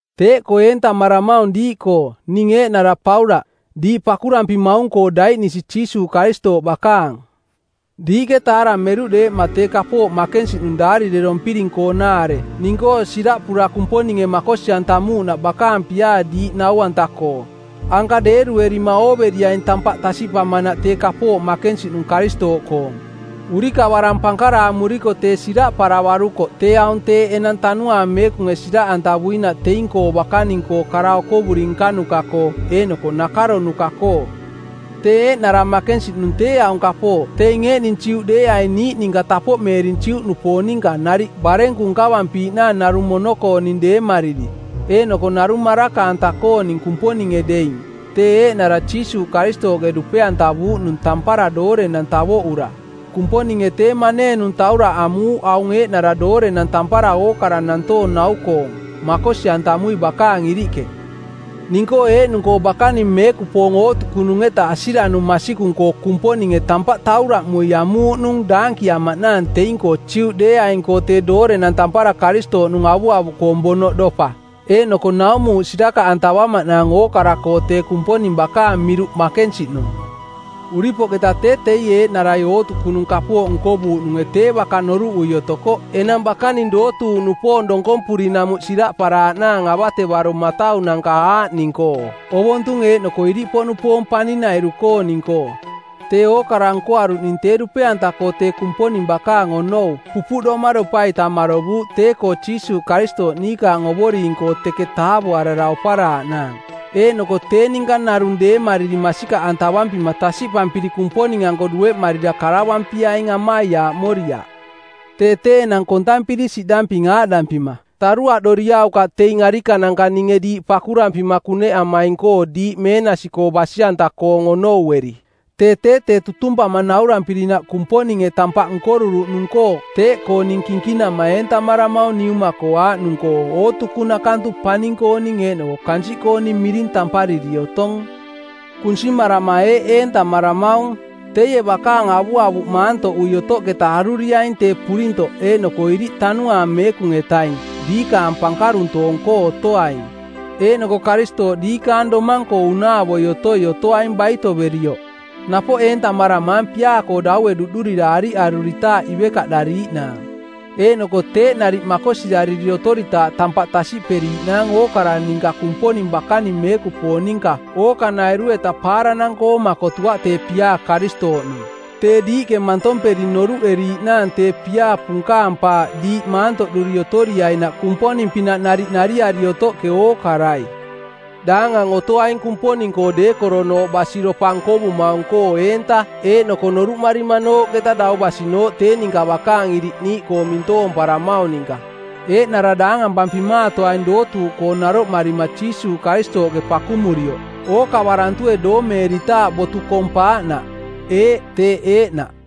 Teeꞌkoo eentamaramaung diiꞌkoo, ning eeꞌnara Paulaꞌ, diiꞌ pakurampimaung-koo daiꞌnisi Jiisuuꞌ Karistooꞌ bakaang. Diiꞌke taarameruꞌ deeꞌma tee kapooꞌ makensiꞌnung daarirerompiring-koonaare ning-koo siraꞌpura Kumponinge makosi-antamuuꞌnaꞌ bakaang piaa diiꞌ nau-anta-koo. Anka deeruerima ooveriaing tampaꞌ tasiꞌpamanaꞌ tee kapooꞌ makensiꞌnung Karistooꞌkoong. Urikavarang pankaraamuriko tee siraꞌparavarukoꞌ tee aung teeꞌ enang Tanuaang Meekunge siraꞌantavuinaꞌ teing-koo bakaning-koo kara okovuri nkanuka-koo eeꞌnoko nakaronuka-koo. Tee eeꞌnara makensiꞌnung tee aung kapooꞌ teing eeꞌning Juꞌ deeaing niiꞌ ninka tapoꞌmeering Juꞌnupoong ninka nariꞌ barenku nkavampiiꞌnaang narung mono-kooning deemariri eeꞌnoko narung maraka-anta-kooning Kumponinge deing, tee eeꞌnara Jiisuuꞌ Karistooꞌke dupe-antavuuꞌnung tampara doorenang tavoꞌura. Kumponinge tee maneenung tauraꞌ amuuꞌ aung eeꞌnara doorenang tampara ookara nantoong nau-koong, makosi-antamui bakaang iriꞌke. Ning-koo eeꞌnung-koo bakaning meekupoong ootukunung-eta asiranung masikung-koo Kumponinge tampaꞌ tauraꞌmui amuuꞌnung daankiamaꞌnaang teing-koo Juꞌdeeaing-koo tee doorenang tampara Karistooꞌnung avuavuꞌkoong bonoꞌdopa. Eeꞌnoko naumuuꞌ sirakaꞌantavamaꞌnaang ookara-koo tee Kumponing bakaang miruꞌ makensiꞌnung. Uripoꞌketa tee teie eeꞌnarai ootukunung kapooꞌ nkovuuꞌnunge tee baka noruꞌui otokoꞌ enang bakaning dootuuꞌnupoong donkompurinamuꞌ siraꞌparaaꞌnaang avatevaro mataunanka aaꞌning-koo ovontung eeꞌnoko iriꞌpoꞌnupoong paning-nairu-kooning-koo. Tee ookara nkoaruꞌning tee dupe-anta-koo tee Kumponing bakaang onou pupuꞌdoma dopa-ita marovuuꞌ tee-koo Jiisuuꞌ Karistooꞌ niikaang Ovoring-koo teke taavoarara oparaaꞌnaang. Eeꞌnoko tee ninka narung deemariri masikaꞌantavampima tasiꞌpampiri Kumponing-anko dueꞌmarira karavampiaing amaiaaꞌmoriaꞌ. Tee tee enang kontampiri siꞌdamping aaꞌdampima, taruaꞌdoriaukaꞌ teing arikananka ninge diiꞌ pakurampima kuneꞌamaing-koo diiꞌ meenasi-koo basi-anta-koong onoueri. Tee tee tee tutumpama naurampirinaꞌ Kumponinge tampaꞌ nkoruruꞌnung-koo teeꞌkoo ning kinkinama eentamaramaung Niuma-koo aaꞌnung-koo ootukunaꞌkantu paning-kooning eeꞌnoko kansiꞌkooning miring tampariri otong. Kunsimarama eeꞌ eentamaramaung: Teie bakaang avuavuꞌ maantoꞌui otoꞌketa aruriaing tee purintoꞌ eeꞌnoko iriꞌ tanuaang Meekung-etaing diikaang pankaruntoong-koo otoaing, eeꞌnoko Karistooꞌ diikaang domang-koo unaavoi otoi otoaing baitoverioꞌ. Napoꞌ eentamaramaang piaa-koo daue duꞌdurira ariꞌaruritaaꞌ ivekaꞌdariiꞌnaang, eeꞌnoko teeꞌ nariꞌ makosirariri otoritaaꞌ tampaꞌ tasiꞌperiiꞌnaang ookara ninka Kumponing bakaning meekupoong ninka ookanairu-eta paaranang-koo makotuaꞌ tee piaa Karistooꞌnung. Tee diiꞌke mantomperi noruꞌeriiꞌnaang tee piaa punkaang˜paaꞌ diiꞌ maantoꞌduri otoriainaꞌ Kumponing-pinaꞌ nariꞌ nariari otoꞌke ookarai. Daangang otoaing Kumponing-koo deekoronooꞌ basiropa nkovumaung-koo eenta eeꞌnoko noruꞌmarimanooꞌketa dau basinooꞌ tee ninka bakaang iriꞌ niiꞌkoo mintoomparamaung ninka. Eeꞌnara daangampampimaatoaing dootuuꞌkoo naroꞌmarima Jiisuuꞌ Karistooꞌke pakumurioꞌ, ookavarantue doomeeritaaꞌ botu kong paaꞌnaꞌ. Eeꞌ, teeꞌ eeꞌnaꞌ.